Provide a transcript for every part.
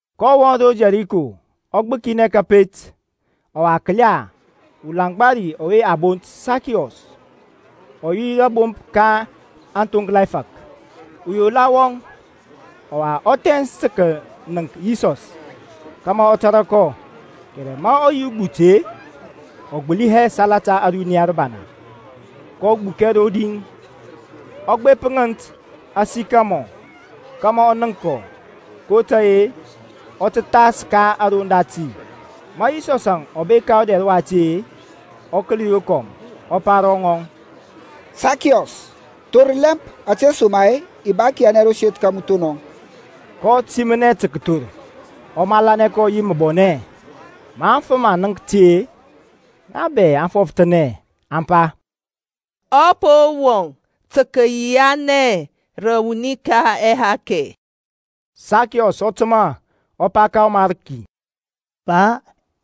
kɔ wɔŋ ro Yɛriko, ɔ gbəkinɛ kȧpet, ɔwa kəla, ulaŋgba ri ɔwe a bont Sakiɔs, ɔ yi rȧbomp ka aŋthoŋkla ɛfȧk, uyola wɔŋ. Ɔwa ɔ thɛns tə kənəŋk Yisɔs kȧmȧ ɔ tȧrȧ kɔ, kɛrɛ ma ɔ yi ugbut-e, ɔ gbəli hɛ salata ȧruniya rəbana. kɔ gbukɛ rodi, ɔ gbep ŋənt asikimɔr kȧmȧ ɔ nənk kɔ, kotȧy-e ɔ tə thas ka aroŋ dati. Ma Yisɔsȧŋ ɔ bek ka ɔdɛr wati-e, ɔ kəli rokɔm, ɔ pa ro ŋɔŋ, Sakiɔs, thor lɛmp, ȧtesoma-e i ba kəyianɛ ro seth ka mu thonɔŋ, kɔ timɔnɛ tə kəthor, ɔ malanɛ kɔ yi məbɔnɛ. Ma aŋfəm aŋ nənk ti-e, ŋa bɛ aŋ fɔfthənɛ aŋ pa, Ɔ po wɔŋ tə kəyianɛ rə wuni ka ɛhakɛ. Sakiɔs ɔ təmȧ ɔ pa ka ɔMarki, Pa,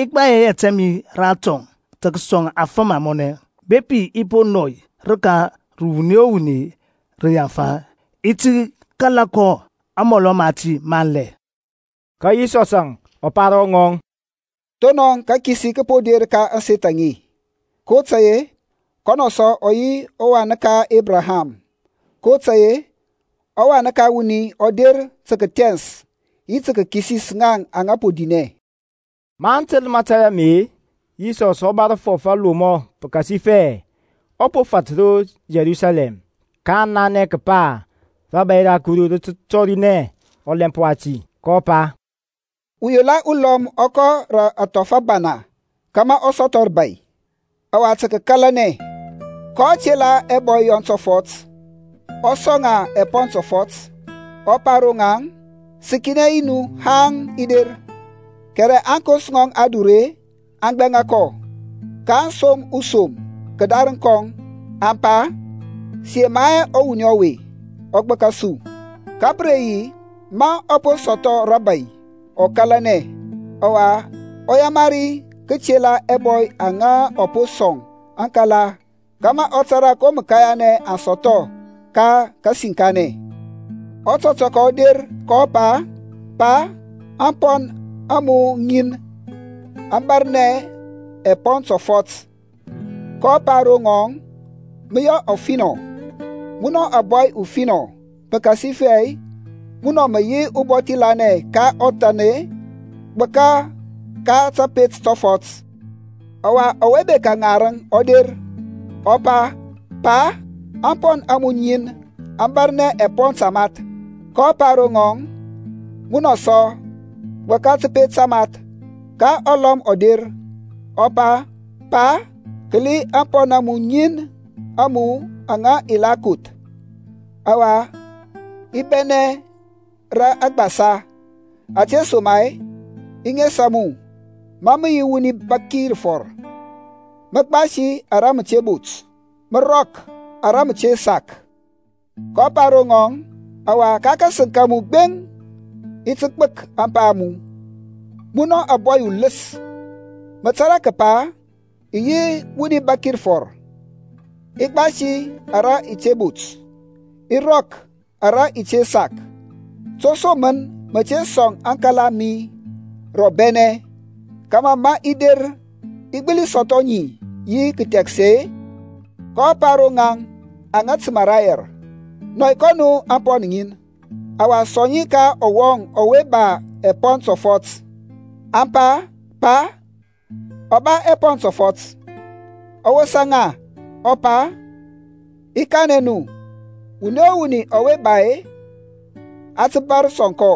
i gbai ɛyɛt ɛ mi ratɔŋ tə kəsɔŋ aŋfəm amɔnɛ. Bepi i po nɔy rəka rə wuni o wuni rə yaŋfa, i ti kala kɔ amɔlɔ mati manlɛ. Ka Yisɔsȧŋ ɔ pa ro ŋɔŋ, Thonɔŋ kakisi kə po der ka ȧŋseth aŋe, kotȧy-e kɔnɔ sɔ ɔ yi wan uruni ka Ebraham. kotȧy-e ɔWan ka wuni ɔ der tə kəthɛns yi tə kəkisis ŋaŋ aŋa po dinɛ. Maŋ təl mȧtȧy ame-e, Yisɔs ɔ bȧr fɔf alomɔ pəkasifɛ ɔ po fat ro Yerusalɛm, kaŋ nanɛ kəpa rȧbȧy ra Kuru rə tə tɔrinɛ ɔlɛmp wati. kɔ pa, Uyola ulɔm ɔ kɔ rə athɔf abara kȧmȧ ɔ sɔthɔ rəbȧy, ɔwa tə kəkalanɛ. kɔ tela ɛbɔy yɔŋ tɔfɔt, ɔ sɔŋ ŋa ɛpɔn tɔfɔt, ɔ pa ro ŋaŋ, Səkinɛ nu haŋ i der. Kɛrɛ aŋkos ŋɔŋ adure aŋ gbɛŋa kɔ, kaŋ som usom kədarəŋ kɔŋ aŋ pa, Sə yema hɛ ɔwuni ɔwe ɔ gbəka su. Ka pə re yi, ma ɔ po sɔthɔ rȧbȧy ɔ kȧlanɛ, ɔwa ɔ yamari kətela ɛbɔy aŋa ɔ po sɔŋ aŋkala kȧmȧ ɔ tȧrȧ ko məkanya aŋ sɔthɔ ka kasəkinɛ. Ɔtɔtɔkɔ ɔ der kɔ pa, Pa, ȧŋpɔn a mu ŋin aŋ bȧrnɛ ɛpɔn tɔfɔt. kɔ pa ro ŋɔŋ, Mə yɔ ɔfinɔ, munɔ ȧŋbɔy ufinɔ; pəkasifɛ munɔ mə yi ubɔthi lanɛ ka ɔthan-e, gbəka ka təpet tɔfɔt. Ɔwa, ɔwe bekȧ ŋarəŋ ɔ der, ɔ pa, Pa, ȧŋpɔn a mu ŋin aŋ bȧrnɛ ɛpɔn tamath. kɔ pa ro ŋɔŋ, Munɔ sɔ, gbəka təpet tamath. Ka ɔlɔm ɔ der, ɔ pa, Pa, kəli ȧŋpɔn ŋin a mu aŋa i la koth, ɔwa i bɛnɛ rə agbasa, ȧtesoma-e i nesa mu ma mə yi wuni bȧk rəfɔr; mə gbasi ara mə te bot, mə rɔk ara mə te sak. kɔ pa ro ŋɔŋ, Ɔwa ka kȧsəŋ ka mu gbeŋ i ti gbək ȧŋpa a mu, munɔ ȧŋbɔy uləs. Mə tȧrȧ kəpa i yi wuni bȧk rəfɔr, i gbasi ara i te bot, i rɔk ara i te sak. To som mən mə te sɔŋ aŋkala a mi rə ɔbɛnɛ, kȧmȧ ma i der i gbəli sɔthɔ ŋi yi kəthɛksɛ-e? kɔ pa ro ŋaŋ aŋa təmȧ rayɛr, Nɔi kɔ nu ȧŋpɔn ŋin, ɔwa sɔŋ ŋi ka ɔwɔŋ ɔwe ba ɛpɔn tɔfɔt. Aŋ pa, Pa, ɔ ba ɛpɔn tɔfɔt. Ɔ wosa ŋa ɔ pa, I kanɛ nu, wuni o wuni ɔwe ba-e, a tə bȧr sɔŋ kɔ;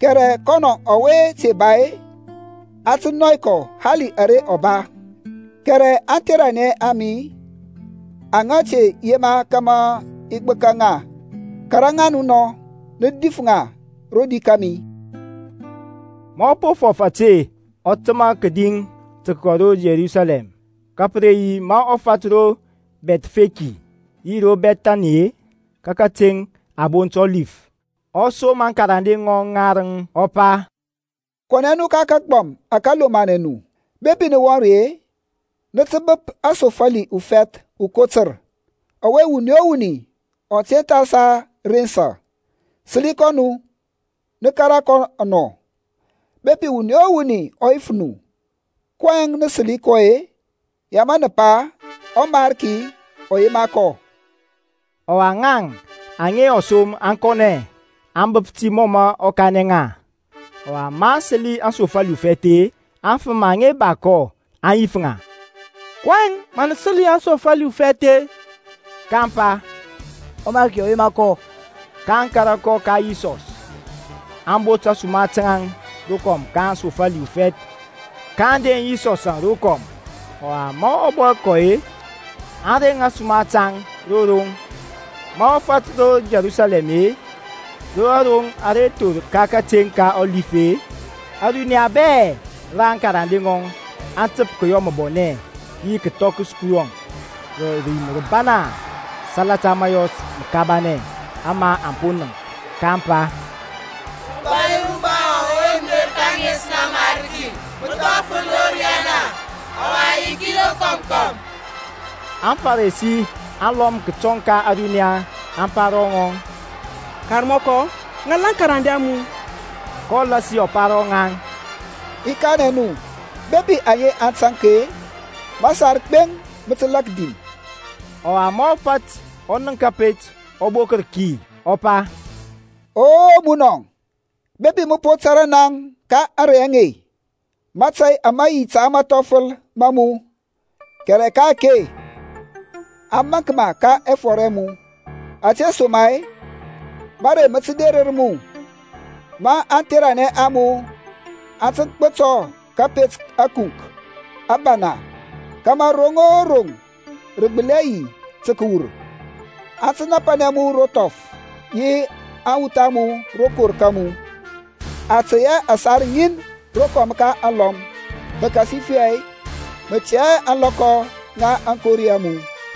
kɛrɛ kɔnɔ ɔwe te ba-e a tə nɔy kɔ hali ara ɔ ba. Kɛrɛ aŋtheranɛ a mi aŋa te yema kȧmȧ i gbəka ŋa, kȧrȧ ŋa nɔ, nə dif ŋa rodi kȧmi. Ma ɔ po fɔf ȧte, ɔ təmȧ kədi tə kəkɔ ro Yerusalɛm. Ka pə re yi ma ɔ fat ro Bɛthfeki yi ro Bɛthani-e, ka kateŋ a bont Ɔlif, ɔ som akarande ŋarəŋ ɔ pa, Kɔnɛ nu ka kagbɔm ȧke lomanɛ nu. Bepi nə wɔŋ ri-e, nə tə bəp asofali ufɛth ukotər, ɔwe wuni o wuni ɔ te tha sa rensa. Səli kɔ nu, nə kȧrȧ kɔ anɔ. Bepi wuni o wuni ɔ yif nu, kɔyɛŋ nə səli kɔ-e, ya mə nə pa, ƆMariki ɔ yema kɔ. Ɔwa ŋaŋ aŋa ɔ som aŋ kɔnɛ, aŋ bəp ti mɔ mə ɔ kanɛ ŋa. Ɔwa maŋ səli aŋsofali ufɛth-e, aŋfəm aŋa ba kɔ aŋ yif ŋa, kɔyɛŋ mə nə səli aŋsofali ufɛth-e? kaŋ pa, ƆMariki ɔ yema kɔ. kaŋ kȧrȧ kɔ ka Yisɔs; aŋ bot ȧsuma taŋ rokɔm ka aŋsofali ufɛth kaŋ deŋ Yisɔsȧŋ rokɔm. Ɔwa ma ɔ bɔ kɔ-e, aŋ rɛns ȧsuma taŋ ro roŋ. Ma ɔ fat ro Yerusalɛm-e, ro aroŋ ara thor ka kateŋ ka Ɔlif-e, ȧruniya bɛ ra aŋkarande ŋɔŋ aŋ təp kəyɔ məbɔnɛ yi kəthɔkəs Kuru rə rim rəbana salata mȧyɔs məkabanɛ ama aŋ po nənk. kaŋ pa, Ubȧy uruba wɔŋ ɔwe mə der ka ȧŋes ŋa ɔMarki; məthɔfəl ro riyana, ɔwa yiki rokɔm kɔm. AŋFarisi alɔm kətɔŋ ka ȧruniya aŋ pa ro ŋɔŋ, Karmɔkɔ, ŋal aŋkarande a mu. kɔ lasi ɔ pa ro ŋaŋ, I kanɛ nu, bepi aŋe aŋ taŋk-e, masar gbeŋ mə tə lak dim. Ɔwa ma ɔ fat ɔ nənk kȧpet, ɔ bokər ki, ɔ pa, O munɔ, bepi mə po tȧrȧ naŋ ka ȧŋrey aŋe, mȧtȧy ama yi ta mathɔfəl ma mu! Kɛrɛ ka-ake a maŋk ma ka ɛfɔr ɛ mu. Ȧtesoma-e mȧrey mə tə derər mu, ma aŋtheranɛ a mu aŋ tə gbətɔr kȧpet ȧkunk abana kȧmȧ roŋ o roŋ rə gbəli hɛ yi tə kəwur. Aŋ tə napanɛ mu ro thɔf yi aŋwuth a mu rokor ka mu. Aŋ tey hɛ ȧsar ŋin rokɔm ka alɔm pəkasifɛ mə tɛ hɛ ȧŋlɔkɔ ŋa aŋkori a mu.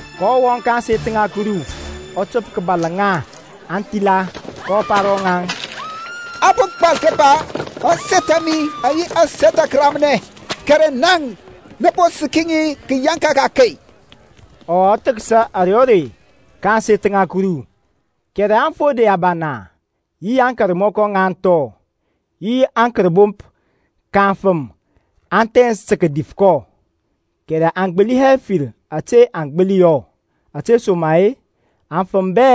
kɔ wɔŋ ka ȧŋseth ŋa Kuru ɔ təp kəbȧl aŋa thila. kɔ pa ro ŋaŋ, A po gbal kəpa, Ȧŋseth a mi aŋ yi aseth ŋa kəramnɛ, kɛrɛ naŋ nə po səki ŋi kəyaŋka ka akey. Ɔwa ɔ thəksa ȧrey o rei ka ȧŋseth ŋa Kuru, kɛrɛ aŋfode abana yi aŋkarmɔkɔ ŋa aŋthɔ, yi aŋkərbomp ka aŋfəm aŋ thɛns tə kədif kɔ, kɛrɛ aŋ gbəli hɛ fir ȧte aŋ gbəli yɔ, ȧtesoma-e aŋfəm bɛ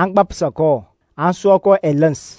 aŋ gbapsa kɔ, aŋ sua kɔ ɛləns.